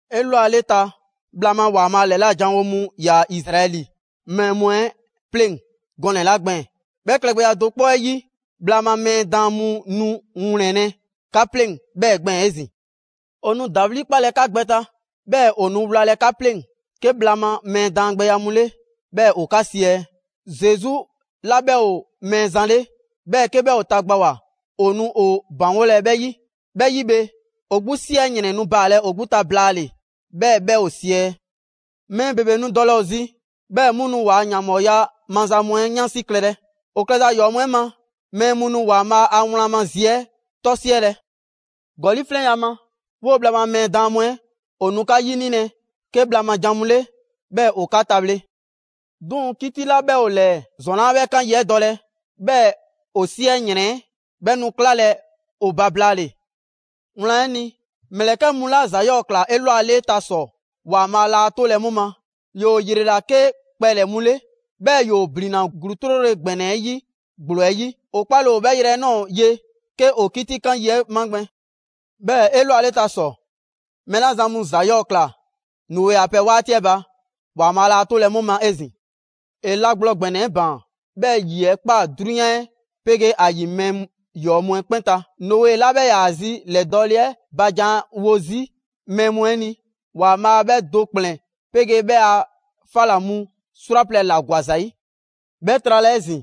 'Elwaleta, bhla ma ‑Waanbhaa' ‑lɛla' janwo mu ‑yaa Izraɛli mɛɛ mu 'ɛ 'pleŋ‑ gɔnɛ‑ 'la gbɛɛn‑, 'bhɛ klɛgbɛya do 'kpɔ 'ɛ 'yi, bhla ma mɛɛ daan mu nu ‑wlɛnlɛ' 'ka 'pleŋ‑ 'bhɛɛ‑ gbɛɛn‑ 'ezin‑. ‑O nu ‑dawli' 'kpalɛ‑ 'ka gbɛ ta, 'bhɛɛ‑ ‑o nu wlalɛ 'ka 'pleŋ‑ 'ke bhla ma mɛɛ daangbɛya mu 'le, 'bhɛɛ‑ ‑o 'ka 'siɛ‑. Zesu 'la 'bhɛ ‑o Mɛɛzan 'le 'bhɛɛ‑ 'ke 'bhɛ ‑o tagbawoa, ‑o nu ‑o ‑baŋgolɛ 'bhɛ 'yi. 'Bhɛ 'yi bhe, ‑o 'gbu 'siɛ ‑yrɛn nu baalɛ ‑o 'gbu ta blaale‑, 'bhɛɛ‑ 'bhɛ ‑o siɛ. Mɛɛ ‑bebe nu dɔlɛ ‑o zi, 'bhɛɛ‑ 'mu nu ‑waa' ‑yanbhɔɔya maza mu 'ɛ 'yansi klɛlɛ. ‑O klɛza ‑yɔɔ' mu 'ɛ ma, mɛɛ mu nu ‑Waanbhaa' a wlan ma zi 'ɛ 'tɔ 'siɛlɛ‑. ‑Gɔli' 'flɛnya‑ 'ɛ ma, 'woo‑ bhla ma mɛɛ daan mu 'ɛ ‑o nu 'ka 'yinilɛ 'ke bhla ma jan mu 'le, 'bhɛɛ‑ ‑o 'ka tabhle. 'Duŋ‑, 'kiti 'la 'bhɛ ‑o ‑lɛɛ, ‑zɔn 'laa 'bhɛ 'kan yi 'ɛ dɔlɛ, 'bhɛɛ‑ ‑o 'siɛ ‑yrɛn 'ɛ 'bhɛ nu 'klalɛ‑ ‑o ba blaale‑. Wlan 'ɛ ni, ‑mlɛkɛ' mu 'la ‑za 'yɔɔ‑ ꞊kla 'elwaleta ‑sɔ, ‑Waanbhaa' laa 'tolɛ‑ 'mu ma, ‑yoo ‑yrela 'ke kpɛlɛ‑ mu 'le, 'bhɛɛ‑ ‑yoo ‑blinna ‑gluu 'trole‑ ‑gbɛnɛ 'ɛ 'yi ‑gblo 'ɛ yi. ‑O 'kpale‑ ‑o 'bhɛɛ‑ yrɛ 'ɛ ꞊nɔɔ ye 'ke ‑o 'kitikan yi 'ɛ magbɛn. 'Bhɛɛ‑ 'elwaleta ‑sɔ, mɛɛ 'la zan mu ‑za 'yɔɔ‑ ‑kla Noe a pɛ 'waati 'ɛ ba, ‑Waanbhaa' laa 'tolɛ‑ 'mu ma 'ezin‑. ‑E la gblɔ ‑gbɛnɛ 'ɛ ‑baan, 'bhɛɛ‑ ‑yi 'ɛ ‑kpaa 'drunyan 'ɛ 'pegee ‑a ‑yi mɛɛ ‑yɔɔ' mu 'ɛ 'kpɛn ta. Noe 'la 'bhɛ 'yaa‑ zi ‑lɛdɔɔle 'ɛ ba janwo 'zi mɛɛ mu 'ɛ ni, ‑Waanbhaa' 'bhɛ do ‑kplɛn 'pegee 'bhɛɛ‑ a 'fa ‑la mu 'srwaplɛ‑ ‑la ‑gwa ‑za 'yi. 'Bhɛ trala 'ezin‑,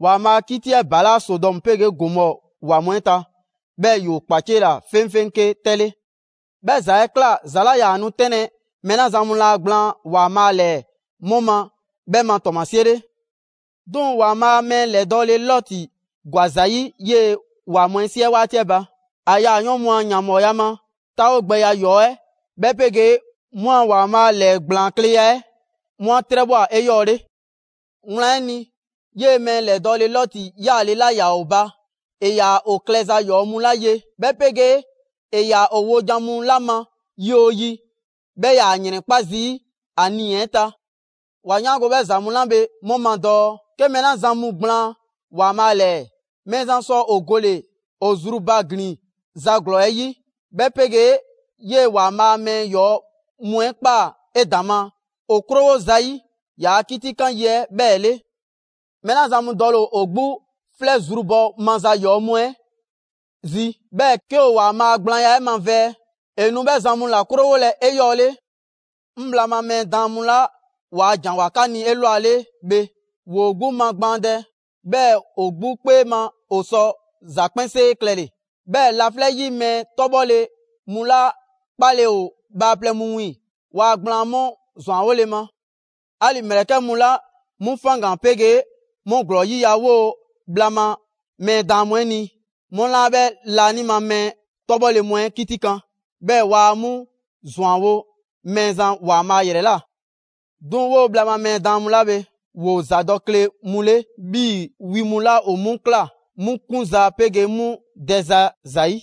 ‑Waanbhaa' a 'kiti 'ɛ ‑balaa' Sodɔmu 'pegee Gomɔɔ ‑wa mu 'ɛ ta, 'bhɛɛ‑ ‑yoo 'kpaciela 'feŋfeŋ 'ke 'tɛ 'le. 'Bhɛ ‑za 'ɛ ꞊kla ‑za 'la 'yaa‑ nu 'tɛnlɛ‑ mɛɛ 'la zan mu laa gblaan ‑Waanbhaa' ‑lɛɛ 'mu ma 'bhɛ ma ‑tɔɔmasie 'le. 'Duŋ‑ ‑Waanbhaa' mɛɛ ‑lɛdɔɔle Lɔti ‑gwa ‑za 'yi 'yee‑ ‑wa mu 'ɛ 'siɛ 'waati 'ɛ ba. ‑A yaayɔɔn' mu a ‑yanbhɔɔya ma 'taawogbɛya ‑yɔɔ 'ɛ, 'bhɛ 'pegee 'mu a ‑Waanbhaa' ‑lɛɛgblaankleya 'ɛ, 'mu 'a 'trɛbhwa꞊ 'eyɔɔle. Wlan 'ɛ ni, 'yee‑ mɛɛ ‑lɛdɔɔle Lɔti yaale 'la ‑yaa ‑o ba, ‑e ‑yaa ‑o klɛza ‑yɔɔ mu 'la ye, 'bhɛ 'pegee ‑e ‑yaa ‑o wojan mu 'la ma yi 'oo yi, 'bhɛ 'yaa‑ ‑yrɛnkpa' zii' ‑a nii‑ 'ɛ ta. 'Wa 'yaango‑ 'bhɛ ‑za mu 'la bhe 'mu ma dɔɔ 'ke mɛɛ 'la zan mu gblaan ‑Waanbhaa ‑lɛɛ, Mɛɛzan sɔ ‑o gole‑ ‑o zrubaglin ‑za ‑glɔɔ 'ɛ 'yi, 'bhɛ 'pegee 'yee ‑Waanbhaa mɛɛ 'yɔɔ‑ mu 'ɛ kpa 'edaŋma ‑o 'krowo‑ zayi' ‑yaa' 'kitikan yi 'ɛ 'bhɛɛ‑ 'le. Mɛɛ 'la zan mu dɔle ‑o ‑o 'gbu 'flɛ zrubhɔ maza ‑yɔɔ' mu 'ɛ zi, 'bhɛɛ‑ 'ke ‑o ‑Waanbhaa' a gblaanya 'ɛ mavɛɛ, ‑e nu 'bhɛ zan mu ‑la 'krowolɛ 'eyɔɔle. 'Ŋ bhla ma mɛɛ daan mu 'la ‑waa' ‑janwoa 'ka ni 'elwale bhe, ‑woo 'gbu magbaandɛ, 'bhɛɛ‑ ‑o 'gbu 'kpee ma ‑o sɔ ‑za 'kpɛnsee klɛle‑. 'Bhɛɛ‑ laflɛ' 'yi mɛɛ 'tɔbhɔle mu 'la 'kpaale‑ ‑o bhaaplɛŋ mu wiiŋ‑, waa gblaan 'mu ‑zwanwole ma. 'Ali‑ ‑mlɛkɛ' mu 'la 'mu faŋgan‑ 'pegee 'mu ‑glɔɔ 'yiya‑ 'woo‑ bhla ma mɛɛ daan mu 'ɛ ni, 'mu laa 'bhɛ laanima mɛɛ 'tɔbhɔle mu 'ɛ 'kitikan, 'bhɛɛ‑ waa 'mu ‑zwanwo' Mɛɛzan ‑Waanbhaa' ‑yrɛ ꞊la. 'Duŋ‑, 'woo‑ bhla ma mɛɛ daan mu 'la bhe, ‑woo ‑zadɔkle mu 'le 'bhii‑ wi mu 'la ‑o 'mu ꞊kla 'mu 'kunza‑ 'pegee 'mu dɛza zayi'.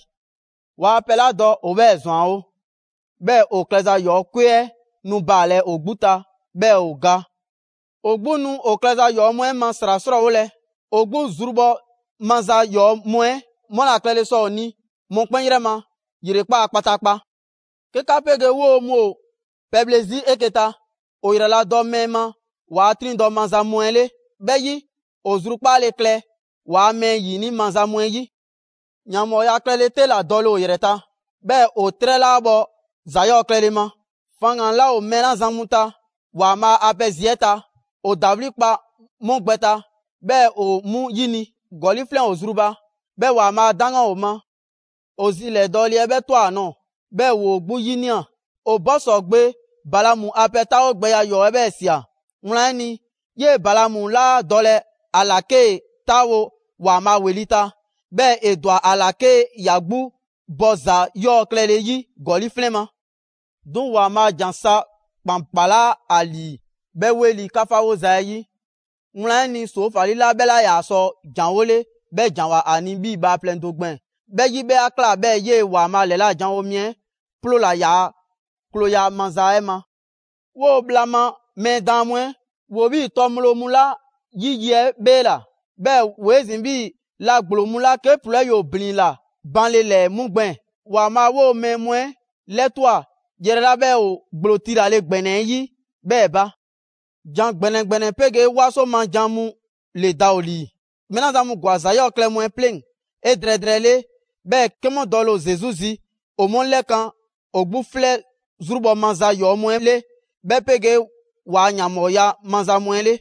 Waa pɛ 'la dɔ, ‑o 'bhɛɛ‑ ‑zwanwo; 'bhɛɛ‑ ‑o klɛza ‑yɔɔ' 'kwe 'ɛ nu baalɛ ‑o 'gbu ta, 'bhɛɛ‑ ‑o ga. ‑O 'gbu nu ‑o klɛza ‑yɔɔ' mu 'ɛ ma ‑sra 'srɔɔwolɛ. ‑O 'gbu zrubhɔ maza ‑yɔɔ' mu 'ɛ 'mu ‑la klɛle sɔ ‑o ni mɔkpɛn' 'yrɛ ma ‑yrekpaa' kpataakpa. 'Ke 'ka 'pegee 'woo‑ mu ‑o pɛbhle 'zi 'eke‑ ta, ‑o ‑yraladɔ mɛɛ ma ‑waa' 'triŋdɔ‑ maza mu 'ɛ 'le. 'Bhɛ 'yi, ‑o zrukpaale klɛ ‑waa' mɛɛ ‑yini' maza mu 'ɛ 'yi. ‑Yanbhɔɔya klɛle 'te ‑la dɔle ‑o ‑yrɛ ta, 'bhɛɛ‑ ‑o 'trɛ 'laa bhɔ ‑za 'yɔɔ‑ klɛle ma. Faŋgan‑ 'laa ‑o mɛɛ 'la zan mu ta ‑Waanbhaa' a pɛ zi 'ɛ ta, ‑o ‑dawli' kpa 'mu gbɛ ta, 'bhɛɛ‑ ‑o 'mu 'yini‑. ‑Gɔli' 'flɛn ‑o zru ba, 'bhɛɛ‑ ‑Waanbhaa' a 'daŋgan ‑o ma. ‑O zi ‑lɛdɔɔle 'ɛ bhɛ ꞊twa ‑a nɔɔ‑, 'bhɛɛ‑ ‑woo 'gbu 'yinia꞊. ‑O Bosɔɔ gbe Balaamu a pɛ 'taawogbɛya ‑yɔɔ' 'ɛ 'bhɛɛ‑ ꞊sia. Wlan 'ɛ ni, 'yee‑ Balaamu 'laa dɔlɛ ‑a ‑la 'kee‑ 'taawo‑ ‑Waanbhaa' ‑weli' ta, 'bhɛɛ‑ ‑e ‑dwa ‑a ꞊la 'ke ‑ya 'gbu bɔ ‑za 'yɔɔ‑ klɛle 'yi ‑gɔli' 'flɛn ma. 'Duŋ‑, ‑Waanbhaa' ‑jan sa ‑kpan 'kpalaa ‑a ‑lii 'bhɛ 'weli‑ 'kafawoza 'ɛ 'yi. Wlan 'ɛ ni, ‑soofali 'la 'bhɛ 'laa sɔ ‑janwole, 'bhɛ ‑janwoa ‑a ni 'bhii‑ bhaaplɛŋ do gbɛɛn‑. 'Bhɛ 'yi, 'bhɛ 'a ꞊kla 'bhɛɛ‑ 'yee‑ ‑Waanbhaa' ‑lɛlajanwo mi 'ɛ ‑ploola ‑yaa' klooya maza 'ɛ ma. 'Woo‑ bhla ma mɛɛ daan mu 'ɛ, ‑woo 'bhii‑ 'tɔ ŋgblo mu 'la 'yi ‑yi 'ɛ 'bheela‑. 'Bhɛɛ‑ ‑woo 'ezin‑ 'bhii‑ la ‑gblo mu 'la 'ke ‑ploo 'ɛ ‑yoo blin la banle ‑lɛɛ 'mu gbɛɛn‑. ‑Waanbhaa' 'woo‑ mɛɛ mu 'ɛ 'lɛtwa꞊ yrɛ 'la 'bhɛ ‑o ‑gblo 'tilale ‑gbɛnɛ 'ɛ 'yi 'bhɛɛ‑ ba. ‑Jan ‑gbɛnɛ ‑gbɛnɛ 'pegee 'waso ma jan mu ‑le da ‑o ‑lii. Mɛɛ 'la zan mu ‑gwa ‑za 'yɔɔ‑ klɛ mu 'ɛ 'pleŋ‑ 'edrɛɛ drɛɛle, 'bhɛɛ‑ 'ke 'mu dɔle‑ ‑o Zesu zi, ‑o 'mu 'lɛkan‑ ‑o 'gbu 'flɛ zrubhɔ maza ‑yɔɔ' mu 'ɛ 'le, 'bhɛ 'pegee ‑waa' ‑yanbhɔɔya maza mu 'ɛ 'le.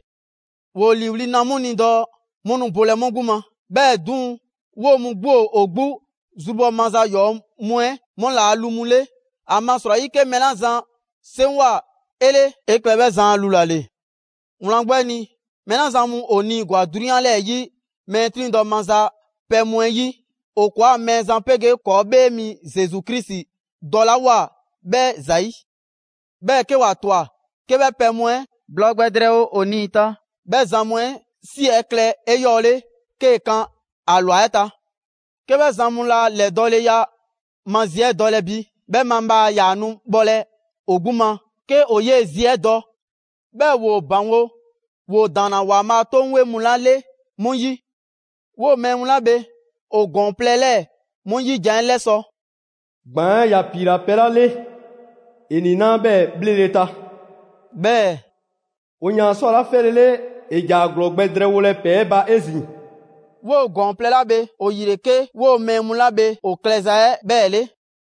‑Woo ‑liiwli' na 'mu ni dɔɔ 'mu nu bolɛ 'mu 'gbu ma, 'bhɛɛ‑ 'duŋ‑, 'woo‑ mu 'gbu ‑o ‑o 'gbu zrubhɔ maza ‑yɔɔ' mu 'ɛ 'mu ‑laa' lu mu 'le. ‑Amasrɔyi 'ke mɛɛ 'la zan 'seŋgwa‑ 'e 'le, 'e klɛ 'bhɛ zan a lu ‑la ‑le. Wlan 'gbu 'ɛ ni, mɛɛ 'la zan mu ‑o 'niigwa‑ 'drunyan 'lɛɛ‑ 'yi mɛɛ 'triŋdɔ‑ maza pɛ mu 'ɛ 'yi, ‑o ‑kɔɔa' Mɛɛzan 'pegee ‑kɔɔ' 'Bhee Mi Zesu Krisi dɔlawoa bhɛ ‑zayi'; 'bhɛɛ‑ 'ke ‑wa 'twa‑ 'ke 'bhɛ pɛ mu 'ɛ blɔɔ gbɛ drɛɛwo ‑o nii‑ ta, 'bhɛ zan mu 'ɛ ‑si 'ɛ klɛ 'eyɔɔle 'kee‑ kan ‑a ‑lwa 'ɛ ta. 'Ke 'bhɛ zan mu laa ‑lɛdɔɔleya ma zi 'ɛ dɔlɛ bi, 'bhɛ mabhaa ‑yaa nu bhɔlɛ ‑o 'gbu ma 'ke ‑o 'yee‑ zi 'ɛ dɔ 'bhɛɛ‑ ‑woo ‑baŋgo' ‑woo ‑daanna ‑Waanbhaa' 'toŋ 'weŋ mu 'la 'le 'mu 'yi. 'Woo‑ mɛɛ mu 'la bhe ‑o ‑gɔɔn plɛ 'lɛɛ‑ 'mu 'yi jan 'ɛ 'lɛsɔ‑: «‑Gbaan' 'ɛ ‑ya ‑piila pɛ 'la 'le, ‑e ‑niinaa' 'bhɛɛ‑ 'bhlele‑ ta.» 'Bhɛɛ‑: «‑O ‑yaan ꞊swa 'la 'fɛlele, ‑e ‑ja ‑a ‑glɔɔ gbɛ drɛɛwolɛ ‑pɛɛ 'ɛ ba 'ezin‑.» 'Woo‑ ‑gɔɔn plɛ 'la bhe ‑o ‑yi ‑le 'ke 'woo‑ mɛɛ mu 'la bhe ‑o klɛza 'ɛ 'bhɛɛ‑ 'le.